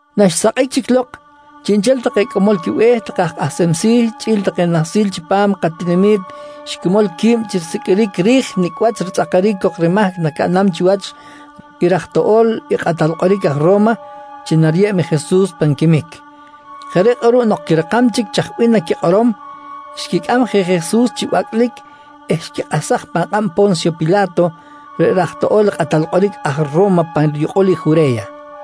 Naxsakꞌic chic lok, chiꞌnchel take cꞌamol quibe̱h take aj kꞌahsem si̱ chꞌi̱l take nahsil chipam katinami̱t xquimol qui̱b chi risiqꞌuiric ri̱j nicꞌ wach ritzꞌakaric cok rimahc nacaꞌnam chiwach i raj toꞌo̱l i kꞌatal kꞌoric aj Ro̱ma chi nariyeb i Jesus pan quimic. Jeꞌ reꞌ kꞌuruꞌ nok quirakam chic chaj bih naquikꞌorom, xquicꞌam je Jesus chi bacꞌlic eh xquikꞌahsaj pan kꞌab i Po̱nsyo Pila̱to reꞌ raj toꞌo̱l i kꞌatal kꞌoric aj Ro̱ma pa riyukꞌul i Jure̱ya.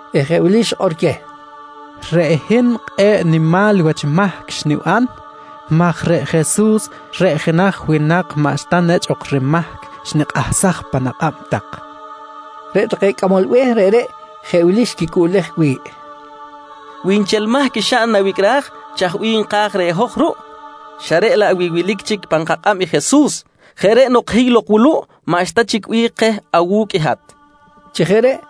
eh jeꞌ wili xikꞌor queh: «Reꞌ hin kꞌe̱ꞌ nimal wach mahc xniban maj reꞌ Jesus reꞌ jenaj winak maꞌxta nechꞌ ok rimahc, xnikꞌahsaj pan akꞌab tak, nqui xikꞌor queh. Reꞌ take cꞌamol be̱h reꞌreꞌ jeꞌ wili xquicꞌuꞌlej wi̱ꞌ: «Wi nchel mahc xaꞌn nawicꞌraj, chaj bih nka̱j reh hoj ruꞌ? xa reꞌ laꞌ wi wilic chic pan kakꞌab i Jesus. Jeꞌ reꞌ nok, hiy lok wuluꞌ maꞌxta chic bih keh awu̱cꞌ i hat, nqui take reh.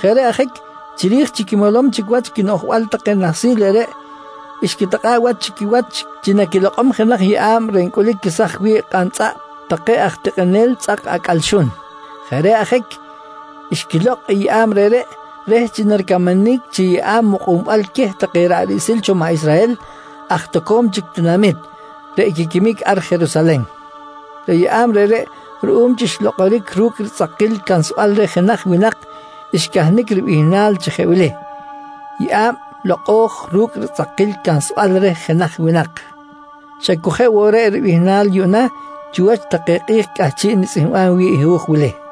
Jeꞌ reꞌ ajic chiri̱j chi quimolom chic wach quinoꞌjbal take nahsil reꞌreꞌ, xquitikꞌa̱ꞌ wach chi quiwach chi naquilokꞌom jenaj yeꞌa̱b reꞌ ncꞌulic quesaj wi̱ꞌ kꞌantzꞌaꞌp take aj tikꞌinel tzꞌak acꞌal xun. Jeꞌ reꞌ ajic xquilokꞌ i yeꞌa̱b reꞌreꞌ reh chi naricamanic chi yeꞌa̱b mukꞌunbal queh take ra̱ꞌ riꞌsil cho maꞌ Israhel aj toco̱m chic tinamit, reꞌ quiquimic ar Jerusalen. Reꞌ yeꞌa̱b reꞌreꞌ ruꞌum chi xlokꞌoric ru̱cꞌ ritzꞌakil cansbal reh jenaj winak, xcahnic ribihnal chi jeꞌ wili: “Yeꞌa̱b Lokꞌo̱j Ru̱cꞌ Ritzꞌakil Cansbal Reh Jenaj Winak”. Xa cu jeꞌ woꞌ reꞌ ribihnal yuꞌna chiwach take kꞌi̱j cꞌahchiꞌ nitzꞌihmbam wi̱ꞌ i hu̱j wili.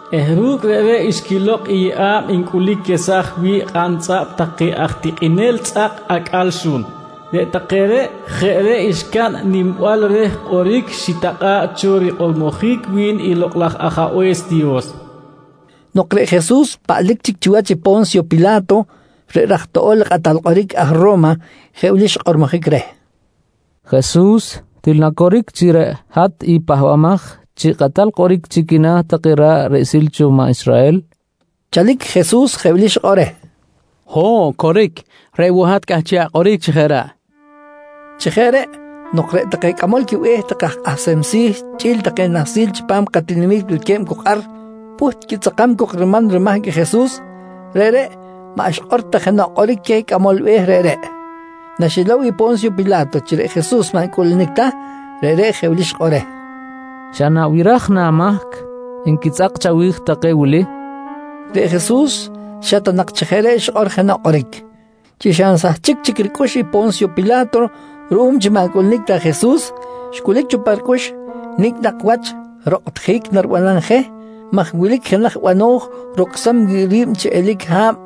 eh ru̱cꞌ reꞌreꞌ xquilokꞌ i yeꞌa̱b ncꞌulic quesaj wi̱ꞌ kꞌantzꞌaꞌp take aj tikꞌinel tzꞌak acꞌal xun. Reꞌ take reꞌ jeꞌ reꞌ xcaꞌn nimbal reh kꞌoric xitakꞌa̱ꞌ cho rikꞌormojic wi̱n i Lokꞌ laj Ajabe̱s Dios, nqui rikꞌor chipam i hu̱j reꞌreꞌ. Nok reꞌ Jesus paꞌlic chic chiwach i Po̱nsyo Pila̱to reꞌ raj toꞌo̱l i kꞌatal kꞌoric aj Ro̱ma, jeꞌ wili xkꞌormojic reh: «Jesus, til na coric chi reꞌ hat i Pahbamaj chi Kꞌatal Kꞌoric chi quina̱ take ra̱ꞌ riꞌsil cho maꞌ Israhel? nqui xkꞌormojic. Chalic Jesus jeꞌ wili xikꞌor reh: «Ho̱ꞌ, coric. Reꞌ woꞌ hat cꞌahchiꞌ akꞌoric chi jeꞌ reꞌ, nqui xikꞌor. Chi jeꞌ reꞌ, nok reꞌ take cꞌamol quibe̱h take aj kꞌahsem si̱ chꞌi̱l take nahsil chipam katinami̱t wilque̱b cok ar, pꞌuht quitzꞌakam cok riman rimahc i Jesus, reꞌreꞌ maꞌ xikꞌor ta jenoꞌ kꞌoric queh cꞌamol be̱h reꞌreꞌ. Naxilow i Po̱nsyo Pila̱to chi reꞌ Jesus maꞌ ncꞌuꞌlunic ta, reꞌreꞌ jeꞌ wili xikꞌor reh: «Xa nabiraj na amahc nquitzꞌak chawi̱j take wili? nqui reh. Reꞌ Jesus xa ta nak chi jeꞌ reꞌ xikꞌor jenoꞌ kꞌoric. Chi xa nsahchic chic ricꞌux i Po̱nsyo Pila̱to ruꞌum chi maꞌ ncꞌuꞌlunic ta Jesus, xcꞌulic cho pa ricꞌux nicꞌ nak wach rokꞌtjic naribanam je maj wilic jenaj bano̱j rocsam wi̱ꞌ ri̱b chi eli̱c ha̱b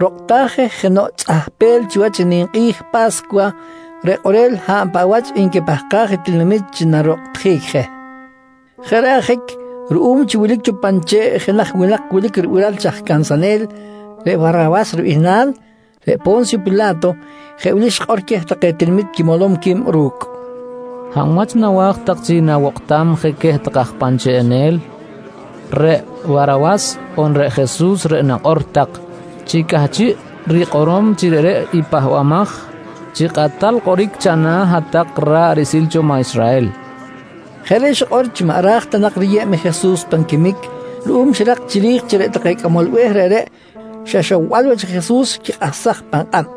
rokꞌtaj je jenoꞌ tzꞌahpel chiwach i ninkꞌi̱j Pa̱scuwa, reꞌ kꞌorel hab paꞌ wach nquipahkaj i tinamit chi narokꞌtjic je. Jeꞌ reꞌ ajic ruꞌum chi wilic cho pan che̱ꞌ jenaj winak wilic ribiral chi aj cansanel reꞌ Warawas ribihnal, reꞌ Po̱nsyo Pila̱to jeꞌ wili xikꞌor queh take tinamit quimolom qui̱b ru̱cꞌ: «Hab wach nawa̱j tak chi nawokꞌtam je queh take aj pan cheꞌenel, reꞌ Warawas on reꞌ Jesus reꞌ nakꞌor tak chi cꞌahchiꞌ rikꞌorom chi reꞌreꞌ i Pahbamaj chi Kꞌatal Kꞌoric chana̱ hat-tak ra̱ꞌ riꞌsil cho maꞌ Israhel? nqui xikꞌor queh. Jeꞌ reꞌ xikꞌor chi maꞌ ra̱j ta nak riyeb i Jesus pan quimic ruꞌum xirak chiri̱j chi reꞌ take cꞌamol be̱h reꞌreꞌ, xa ixowbal wach i Jesus xquikꞌahsaj pan kꞌab.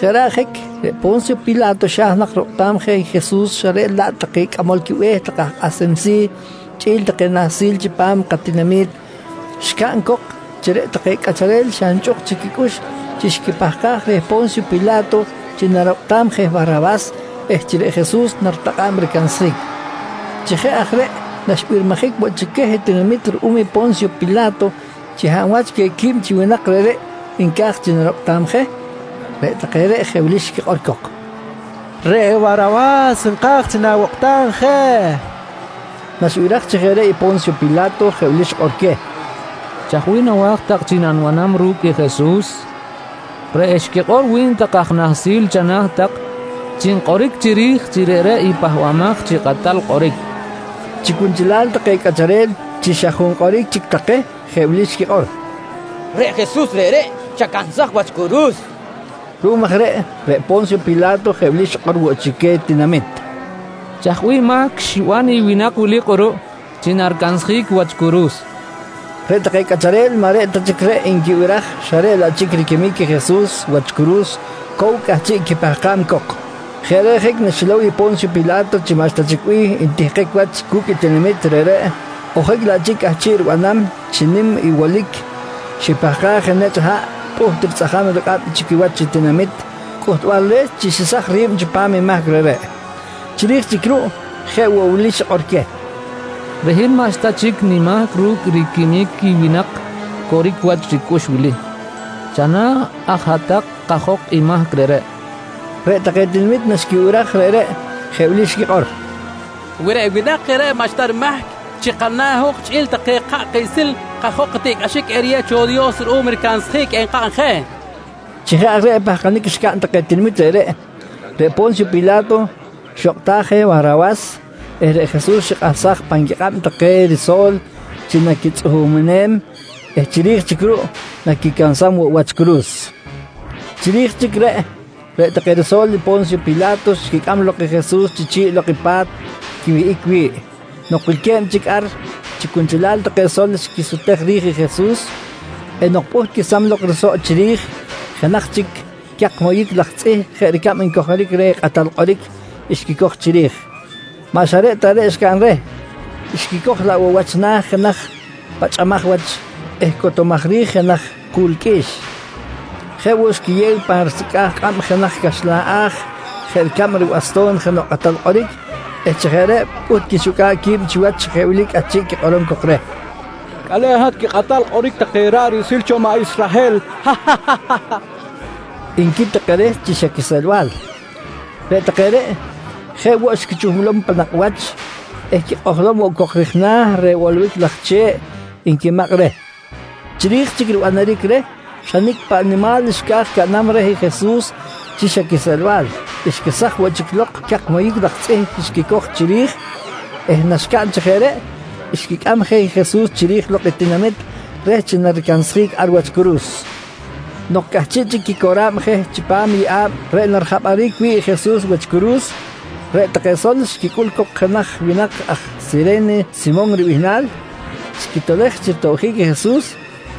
Jeꞌ reꞌ ajic reꞌ Po̱nsyo Pila̱to xa̱j nak rokꞌtam je i Jesus xa reꞌ laꞌ take cꞌamol quibe̱h take aj kꞌahsem si̱ chꞌi̱l take nahsil chipam katinami̱t, xcaꞌn cok chi reꞌ take cꞌacharel xa nchꞌuk chic quicꞌux chi xquipahkaj reh Po̱nsyo Pila̱to chi narokꞌtam je i Warawas eh chi reꞌ Jesus naritakꞌa̱b ricansjic. Chi jeꞌ aj reꞌ, naxbirmijic woꞌ chic queh tinamit ruꞌum i Po̱nsyo Pila̱to chi hab wach queh qui̱b winak reꞌreꞌ nca̱j chi narokꞌtam je, reꞌ take reꞌ jeꞌ wili xquikꞌor cok: «Reꞌ Warawas nka̱j chi nawokꞌtam je, nqui take reh. Naxibiraj chi jeꞌ reꞌ i Po̱nsyo Pila̱to jeꞌ wili xikꞌor queh: «Chaj bih nawa̱j tak chi nanibanam ru̱cꞌ i Jesus reꞌ xquikꞌor wi̱n take aj nahsil chana̱ tak chi nkꞌoric chiri̱j chi reꞌreꞌ i Pahbamaj chi Kꞌatal Kꞌoric, nqui queh. Chi cunchelal take cꞌacharel chi xa junkꞌoric chic take, jeꞌ wili xquikꞌor: «Reꞌ Jesus reꞌreꞌ chacansaj wach curu̱s, nqui take. Ruꞌum aj reꞌ, reꞌ Po̱nsyo Pila̱to jeꞌ wili xikꞌor woꞌ chic queh tinamit: «Chaj bih mahc xiban i winak wili kꞌuruꞌ chi naricansjic wach curu̱s, nqui queh. Reꞌ take cꞌacharel maꞌ reꞌ ta chic reꞌ nquibiraj xa reꞌ laꞌ chic riquimic i Jesus wach curu̱s cow cꞌahchiꞌ quipahkam cok. Jeꞌ reꞌ ajic naxilow i Po̱nsyo Pila̱to chi maꞌxta chic bih ntihkic wach cu̱cꞌ i tinamit reꞌreꞌ, ojic laꞌ chic cꞌahchiꞌ ribanam chi nim i wolic, xipahkaj je nechꞌ haꞌ eh pꞌuht ritzꞌajam rikꞌab chi quiwach i tinamit cꞌuhtbal reh chi xesaj ri̱b chipam i mahc reꞌreꞌ. Chiri̱j chic ruꞌ jeꞌ woꞌ wili xikꞌor queh: «Reꞌ hin maꞌxta chic nimahc ru̱cꞌ riquimic i winak coric wach ricꞌux wili. Chana̱ aj tak hat-tak kajok i mahc reꞌreꞌ, nqui queh. Reꞌ take tinamit naxquibiraj reꞌreꞌ, jeꞌ wili xquikꞌor: «Wi reꞌ winak reꞌreꞌ maꞌxta rimahc, chi kana̱ i hoj chꞌi̱l take ka̱ꞌ kiꞌsil, kajok i tiꞌcꞌaxic eriyew cho i Dios ruꞌum ricansjic enkaꞌn je, nqui take. Chi jeꞌ aj reꞌ pahkanic xcaꞌn take tinamit reꞌreꞌ, reꞌ Po̱nsyo Pila̱to xokꞌtaj je i Warawas eh reꞌ Jesus xikꞌahsaj pan quikꞌab take riso̱l chi naquitzꞌuhumem eh chiri̱j chic ruꞌ naquicansam woꞌ wach curu̱s. Chiri̱j chic reꞌ, reꞌ take riso̱l i Po̱nsyo Pila̱to xquicꞌam lok Jesus chi chi̱ꞌ lok i pa̱t quiwihꞌic wi̱ꞌ. Nok wilque̱b chic ar chi cunchelal take sol xquisutej ri̱j i Jesus eh nok pꞌuht quesam lok risoꞌ chiri̱j, jenaj chic cak moyic laj tzꞌih jeꞌ ricab ncojoric reh jenaj kꞌatal kꞌoric, xquicoj chiri̱j. Maꞌ xa reꞌ ta reꞌ xcaꞌn reh, xquicoj laꞌ woꞌ wach na̱ jenaj pachꞌamaj wach eh cotomaj rij jenaj ku̱l qꞌui̱x. Jeꞌ woꞌ, xquiyew pan risecꞌa̱j kꞌab jenaj caxlan a̱j jeꞌ ricab ribasto̱n jenoꞌ kꞌatal kꞌoric eh chi jeꞌ reꞌ pꞌuht quixucꞌa̱b qui̱b chiwach chi jeꞌ wili cꞌahchiꞌ quikꞌorom cok reh: «Cꞌale̱n, hat quikꞌatal kꞌoric take ra̱ꞌ riꞌsil cho maꞌ Israhel! nqui take reh chi xa quiseꞌlbal. Reꞌ take reꞌ, jeꞌ woꞌ xquichuhmlom pan nakꞌ wach eh quikꞌojlom woꞌ cok rij na̱ reh bolobic laj che̱ꞌ nquimakꞌ reh. Chiri̱j chic ribanaric reh xa nicꞌ paꞌ nimal xca̱j caꞌnam reh Jesus chi xa quiseꞌelbal, xquesaj woꞌ chic lok cak moyic laj tzꞌih xquicoj chiri̱j eh naxcaꞌn chi jeꞌ reꞌ, xquicꞌam je i Jesus chiri̱j lok i tinamit reh chi naricansjic ar wach curu̱s. Nok cꞌahchiꞌ chic quicora̱b je chipam i yeꞌa̱b reꞌ narijapꞌaric wi̱ꞌ i Jesus wach curu̱s, reꞌ take sol xquicꞌul cok jenaj winak aj Sire̱ne Simon ribihnal, xquitolej chi ritobjic i Jesus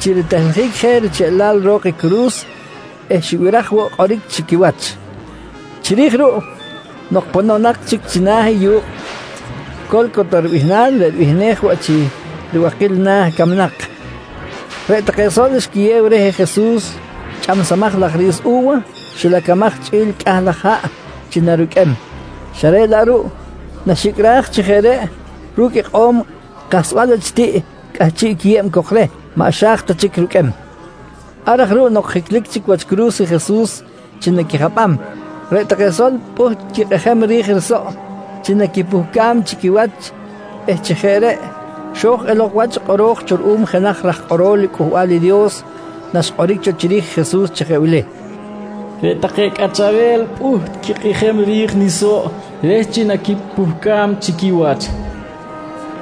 chi ritehljic je richeꞌlal ro̱k i curu̱s eh xibiraj woꞌ kꞌoric chi quiwach. Chiri̱j ruꞌ, nok pononak chic china̱ i yu̱kꞌ “Co̱lcota” ribihnal reꞌ ribihnej woꞌ chi “Ribakil Na̱ Camnak”, reꞌ take sol xquiyew reh Jesus chꞌamsamaj laj ri̱s u̱wa xilacamaj chꞌi̱l cꞌah laj haꞌ chi naruqꞌuem, xa reꞌ laꞌ ruꞌ naxicꞌraj chi jeꞌ ru̱cꞌ ikꞌo̱m kahsbal wach tiꞌ cꞌahchiꞌ quiyeb cok reh, maꞌ xa̱j ta chic ruqꞌuem. Ar aj ruꞌ nok jiclic chic wach curu̱s i Jesus chi naquijapꞌam, reꞌ take sol pꞌuht quikꞌijem ri̱j risoꞌ chi naquipuhcam chi quiwach eh chi jeꞌ reꞌ xo̱j elok wach i kꞌoro̱j cho ruꞌum jenaj raj kꞌorol Cꞌuhbal i Dios naxkꞌoric cho chiri̱j i Jesus chi jeꞌ wili: “Reꞌ take cꞌacharel pꞌuht quikꞌijem ri̱j nisoꞌ, reh chi naquipuhcam chi quiwach, nqui xikꞌor cho.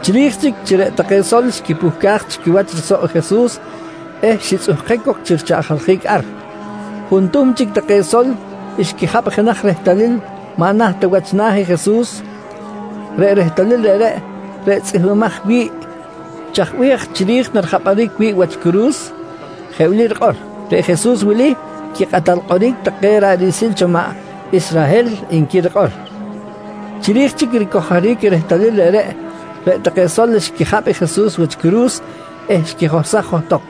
Chiri̱j chic chi reꞌ take sol xquipuhcaj chi quiwach risoꞌ i Jesus eh xitzꞌuhkic cok chi richaꞌjaljic ar, juntuhm chic take sol xquijapꞌ jenaj rehtalil maꞌ naht ta wach na̱ i Jesus. Reꞌ rehtalil reꞌreꞌ, reꞌ tzꞌihmbimaj wi̱ꞌ chaj bih aj chiri̱j narijapꞌaric wi̱ꞌ wach curu̱s, jeꞌ wili rikꞌor: “Reꞌ Jesus wili, quikꞌatal kꞌoric take ra̱ꞌ riꞌsil cho maꞌ Israhel, nqui rikꞌor. Chiri̱j chic ricojoric i rehtalil reꞌreꞌ, reꞌ take sol xquijapꞌ i Jesus wach curu̱s eh xquijohsaj johtok.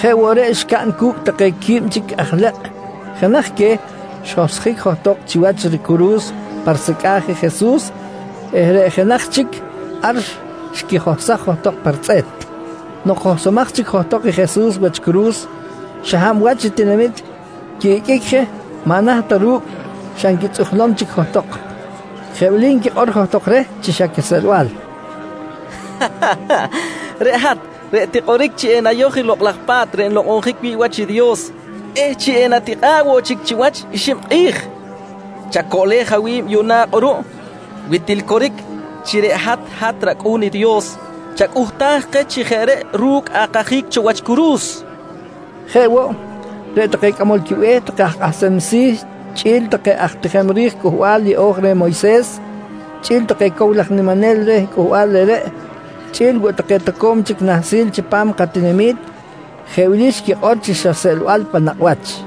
Jeꞌ woꞌ reꞌ xcaꞌn cu̱cꞌ take qui̱b chic aj lekꞌ. Jenaj queh xjohsjic johtok chiwach ricuru̱s pa risecꞌa̱j je i Jesus eh reꞌ jenaj chic ar xquijohsaj johtok pa ritzꞌe̱t. Nok johsomaj chic johtok i Jesus wach curu̱s, xa hab wach tinamit quiꞌiqꞌuic je maꞌ naht ta ru̱cꞌ, xa nquitzꞌujlom chic johtok. Jeꞌ wili nquikꞌor johtok reh chi xa quiseꞌelbal: «Reꞌ hat reꞌ tikꞌoric chi enayoj i Lokꞌ laj Pa̱t reꞌ nlokꞌonjic wi̱ꞌ wach i Dios eh chi enatikꞌa̱ꞌ woꞌ chic chiwach i xib kꞌi̱j, chacoꞌlej awi̱b yuꞌna kꞌuruꞌ. Wi til coric chi reꞌ hat, hat rAcꞌu̱n i Dios, chacꞌuhtaj keh chi jeꞌ reꞌ ru̱cꞌ akajic cho wach curu̱s, nqui nquikꞌor johtok reh. Jeꞌ woꞌ, reꞌ take cꞌamol quibe̱h take aj kꞌahsem si̱ chꞌi̱l take aj tijem ri̱j Cꞌuhbal Yeꞌo̱j reh Moyses, chꞌi̱l take cow laj niminel reh cꞌuhbal reꞌreꞌ, chꞌi̱l woꞌ take toco̱m chic nahsil chipam katinami̱t, jeꞌ wili xquikꞌor chi xa seꞌlbal pan nakꞌ wach: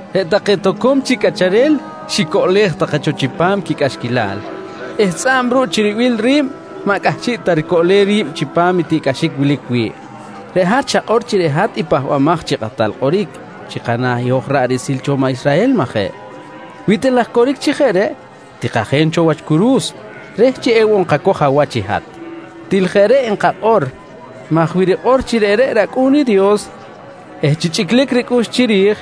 «Reꞌ take toco̱m chic cꞌacharel xicoꞌlej take cho chipam quicꞌaxquilal eh tzꞌa̱b ruꞌ chi ribil ri̱b maꞌ cꞌahchiꞌ ta ricoꞌlem ri̱b chipam i tiꞌcꞌaxic wilic wi̱ꞌ. Reꞌ hat xakꞌor chi reꞌ hat i Pahbamaj chi Kꞌatal Kꞌoric chi kana̱ hoj ra̱ꞌ riꞌsil cho maꞌ Israhel, majeꞌ? Wi til aj coric chi jeꞌ reꞌ, tikajen cho wach curu̱s reh chi ewoꞌ nkacoj awach i hat. Til jeꞌ reꞌ nkakꞌor maj wi rikꞌor chi reꞌreꞌ rAcꞌu̱n i Dios eh chi chꞌiclic ricꞌux chiri̱j,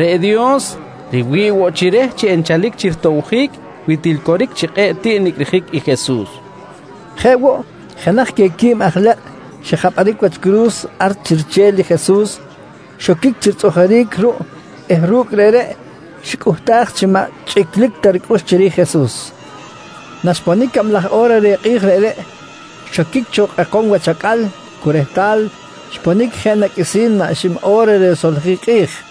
reꞌ Dios riwi̱ꞌ woꞌ chi reh chi enchalic chi ritobjic wi til coric chi kꞌe̱ꞌ tiꞌ nicꞌrijic i Jesus, nqui take. Jeꞌ woꞌ, jenaj queh qui̱b aj lekꞌ xijapꞌaric wach curu̱s ar chi riche̱l i Jesus, xoquic chi ritzꞌujuric ruꞌ eh ru̱cꞌ reꞌreꞌ xicꞌuhtaj chi maꞌ chꞌiclic ta ricꞌux chiri̱j Jesus. Naxponic cablaj o̱ra reh kꞌi̱j reꞌreꞌ, xoquic cho kꞌekom wach acꞌal cu rehtal xponic jeꞌ na qꞌuisi̱n maꞌ xib o̱ra risoljic i kꞌi̱j.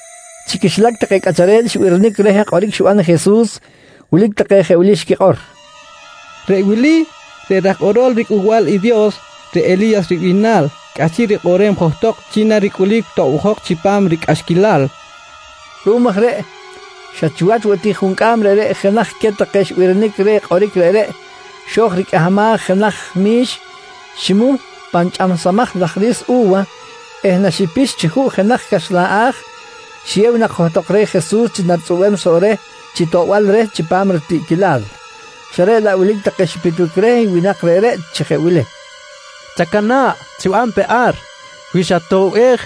Chi quixilac take cꞌacharel xibirinic reh kꞌoric xiban i Jesus, wilic take jeꞌ wili xquikꞌor: «Reꞌ wili, reꞌ aj kꞌorol riCꞌuhbal i Dios, reꞌ Eli̱yas ribihnal cꞌahchiꞌ rikꞌoꞌrem johtok chi naricꞌulic tobjok chipam ricꞌaxquilal, nqui take. Ruꞌum aj reꞌ, xa chiwach woꞌ ti juncꞌam reꞌreꞌ jenaj queh take xibirinic reh kꞌoric reꞌreꞌ xo̱j ricꞌahmaj jenaj mi̱x, ximuh pan chꞌamsamaj laj ri̱s u̱wa eh naxipix chi juꞌ jenaj caxlan a̱j, xiyew nak johtok reh Jesus chi naritzꞌubem soꞌ reh chi toꞌbal reh chipam ritiꞌquilal, xa reꞌ laꞌ wilic take xipitbic reh winak reꞌreꞌ chi jeꞌ wili: «Chacana̱ꞌ, chiban pe ar maj wi xatoꞌbej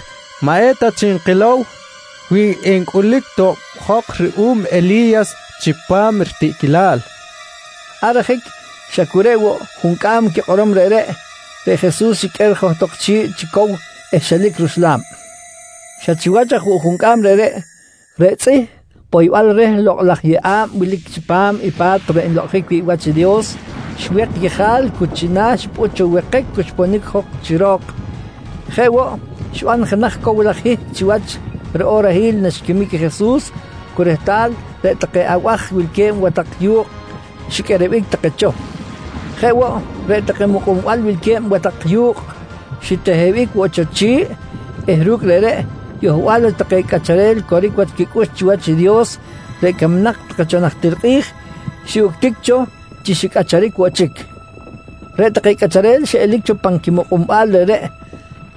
maꞌ eta chic nkilow wi encꞌulic tobjok ruꞌum Eli̱yas chipam ritiꞌquilal, nqui take reh. Ar ajic, xa cu reꞌ woꞌ juncꞌam quikꞌorom reꞌreꞌ, reꞌ Jesus xiqꞌuer johtok chi̱ꞌ chi cow eh xelic ruxla̱b. Xa chiwach aj woꞌ juncꞌam reꞌreꞌ, reꞌ tzꞌih poybal reh lokꞌ laj yeꞌa̱b wilic chipam i pa̱t reꞌ nlokꞌonjic wi̱ꞌ wach i Dios, xwek yejal cu china̱ xipꞌut cho wekic cu xponic jok chi ro̱k. Jeꞌ woꞌ, xiban jenaj cow laj hihc chiwach riꞌorahil naxquimic Jesus cu rehtal reꞌ take abaj wilque̱b watak yu̱kꞌ xiqꞌuerebic take cho. Jeꞌ woꞌ, reꞌ take mukꞌunbal wilque̱b watak yu̱kꞌ xitehebic woꞌ cho chi̱ꞌ eh ru̱cꞌ reꞌreꞌ, yohbal wach take cꞌacharel coric wach quicꞌux chiwach i Dios reꞌ camnak take cho najtir kꞌi̱j, xiꞌuctic cho chi xicꞌacharic woꞌ chic. Reꞌ take cꞌacharel xiꞌelic cho pan quimukꞌunbal reꞌreꞌ,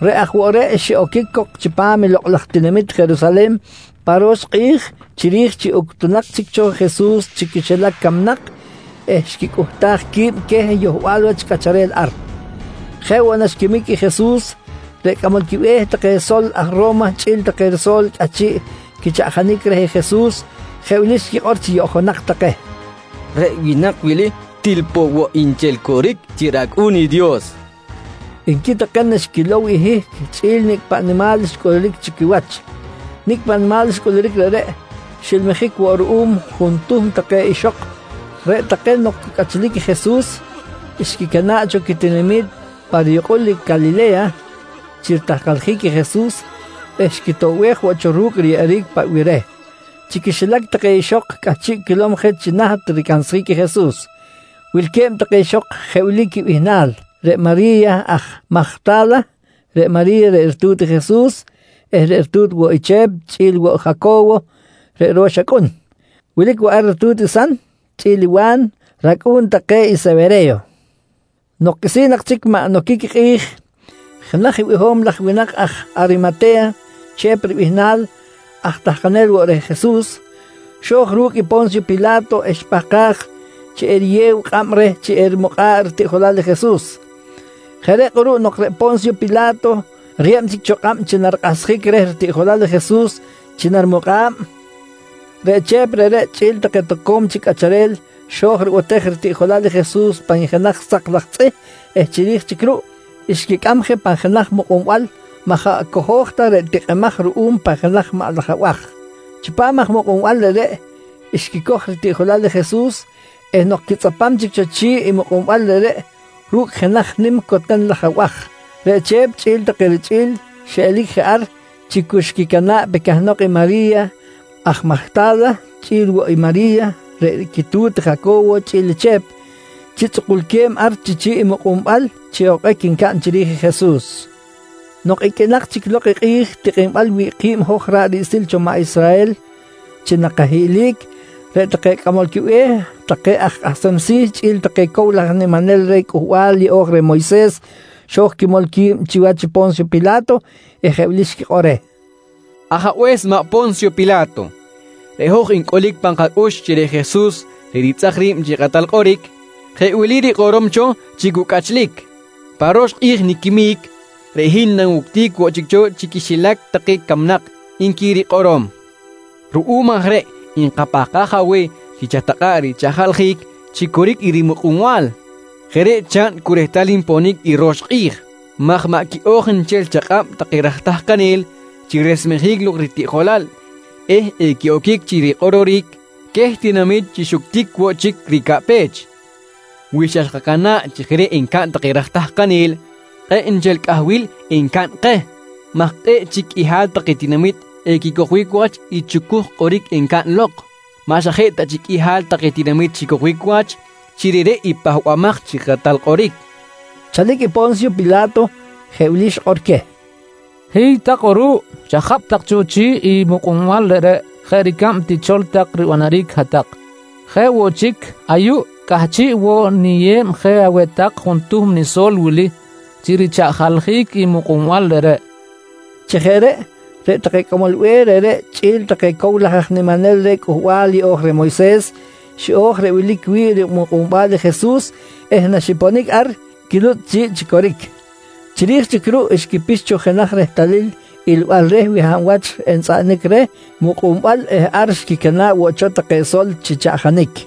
reꞌ aj woꞌ reꞌ xiꞌoquic cok chipam i lokꞌ laj tinamit Jerusalen pa ro̱x kꞌi̱j chiri̱j chi uctunak chic cho Jesus chi quixilac camnak eh xquicꞌuhtaj qui̱b queh yohbal wach cꞌacharel ar. Jeꞌ woꞌ naxquimic i Jesus, reꞌ cꞌamol quibe̱h take sol aj Ro̱ma chꞌi̱l take riso̱l cꞌahchiꞌ quichaꞌjanic reh Jesus, jeꞌ wili xquikꞌor chi yoꞌjonak take: «Reꞌ winak wili til poꞌ woꞌ nchel coric chi rAcꞌu̱n i Dios, nqui take naxquilow i hihc chꞌi̱l nicꞌ paꞌ nimal xcꞌuluric chi quiwach. Nicꞌ paꞌ nimal xcꞌuluric reꞌreꞌ, xilmijic woꞌ ruꞌum juntuhm take ixok reꞌ take nok cu cꞌachlic i Jesus, xquicana̱ꞌ cho quitinami̱t pa riyukꞌul Calile̱ya chi ritahkaljic i Jesus eh xquitoꞌbej woꞌ cho ru̱cꞌ riyeꞌeric paꞌ bih reh. Chi quixilac take ixok cꞌahchiꞌ quilom je chi naht i ricansjic i Jesus, wilque̱b take ixok jeꞌ wili quibihnal: Reꞌ Mari̱ya aj Majta̱la, reꞌ Mari̱ya reꞌ ritu̱t i Jesus eh ritu̱t woꞌ i Chep chꞌi̱l i Jaco̱wo reꞌ ro̱x acꞌun. Wilic woꞌ ar i ritu̱t i San chꞌi̱l i Wa̱n, racꞌu̱n take i Sewere̱yo. Nok qꞌuisi̱n nak chic maꞌ noquic i kꞌi̱j, jenaj biho̱m laj winak aj Arimate̱ya Chep ribihnal, aj tahkanel woꞌ reh Jesus, xo̱j ru̱cꞌ i Po̱nsyo Pila̱to eh xipahkaj chi eriyew kꞌab reh chi erimukꞌa̱ꞌ ritiꞌjolal i Jesus. Jeꞌ reꞌ kꞌuruꞌ nok reꞌ Po̱nsyo Pila̱to riyeb chic cho kꞌab chi narikꞌahsjic reh ritiꞌjolal i Jesus chi narimukꞌa̱b, reꞌ Chep reꞌreꞌ chꞌi̱l take toco̱m chic cꞌacharel xo̱j ribotej ritiꞌjolal i Jesus pan jenaj sak laj tzꞌih eh chiri̱j chic ruꞌ, xquicꞌam je pan jenaj mukꞌunbal maꞌ jaꞌ cojo̱j ta reꞌ tikꞌimaj ruꞌum pan jenaj maꞌ laj abaj. Chipam aj mukꞌunbal reꞌreꞌ, xquicoj ritiꞌjolal i Jesus eh nok quitzꞌapam chic cho chi̱ꞌ i mukꞌunbal reꞌreꞌ ru̱cꞌ jenaj nim coten laj abaj, reꞌ Chep chꞌi̱l take richꞌi̱l xelic je ar chi cu xquicana̱ꞌ pe cahnok i Mari̱ya aj Majta̱la chꞌi̱l woꞌ i Mari̱ya reꞌ quitu̱t i Jaco̱wo chꞌi̱l i Chep, chi tzꞌukulque̱b ar chi chi̱ꞌ i mukꞌunbal chi okꞌic ncaꞌn chiri̱j Jesus. Nok iqꞌuinak chic lok i kꞌi̱j tikꞌinbal wi̱ꞌ ki̱b hoj ra̱ꞌ riꞌsil cho maꞌ Israhel chi nakahiꞌlic, reꞌ take cꞌamol quibe̱h take aj kꞌahsem si̱ chꞌi̱l take i cow laj aj niminel reh Cꞌuhbal Yeꞌo̱j reh Moyses xo̱j quimol qui̱b chiwach i Po̱nsyo Pila̱to, eh jeꞌ wili xquikꞌor reh: «Ajabe̱s maꞌ Po̱nsyo Pila̱to, reꞌ hoj ncꞌulic pan kacꞌux chi reꞌ Jesus reꞌ ritzꞌak ri̱b chi kakꞌatal kꞌoric, jeꞌ wili rikꞌorom cho chi cu cꞌachlic: ‹Pa ro̱x kꞌi̱j niquimic, reꞌ hin nawuctic woꞌ chic cho chi quixilac take camnak, nqui rikꞌorom. «Ruꞌum aj reꞌ nkapahkaj aweh chi chatakꞌa̱ꞌ richaꞌjaljic chi coric i rimukꞌunbal. Jeꞌ reꞌ chaꞌn cu rehtal nponic i ro̱x kꞌi̱j maj maꞌ quiꞌo̱j nchel chakꞌab take raj tahkanel chi resmejic ritiꞌjolal eh equiꞌoquic chi rikꞌororic queh tinamit chi xuctic woꞌ chic ricaꞌpech. Wi xa xkacana̱ꞌ chi jeꞌ reꞌ encaꞌn take raj tahkanel, kꞌe̱ꞌ nchel cꞌahbil encaꞌn keh maj kꞌe̱ꞌ chic qꞌuihal take tinamit equicojbic wach i chucuj kꞌoric encaꞌn lok, maꞌ xa jeꞌ ta chic qꞌuihal take tinamit xicojbic wach chi reꞌreꞌ i Pahbamaj chi Kꞌatal Kꞌoric, nqui take reh. Chalic i Po̱nsyo Pila̱to, jeꞌ wili xikꞌor queh: «Hiy tak kꞌuruꞌ, chajapꞌ tak cho chi̱ꞌ i mukꞌunbal reꞌreꞌ jeꞌ ricab tichol tak ribanaric hat-tak. Jeꞌ woꞌ chic, ayuꞌ cꞌahchiꞌ woꞌ niyeb je aweh tak juntuhm niso̱l wili chi richaꞌjaljic i mukꞌunbal reꞌreꞌ, nqui queh. Chi jeꞌ reꞌ, reꞌ take cꞌamol be̱h reꞌreꞌ chꞌi̱l take cow laj aj niminel reh Cꞌuhbal Yeꞌo̱j reh Moyses xiꞌo̱j reꞌ wilic wi̱ꞌ rimukꞌunbal i Jesus eh naxiponic ar, quilutzꞌ chi̱ꞌ chi coric. Chiri̱j chic ruꞌ xquipix cho jenaj rehtalil ilbal reh wi hab wach entzꞌaꞌanic reh mukꞌunbal eh ar xquicana̱ꞌ woꞌ cho take sol chi chaꞌjanic.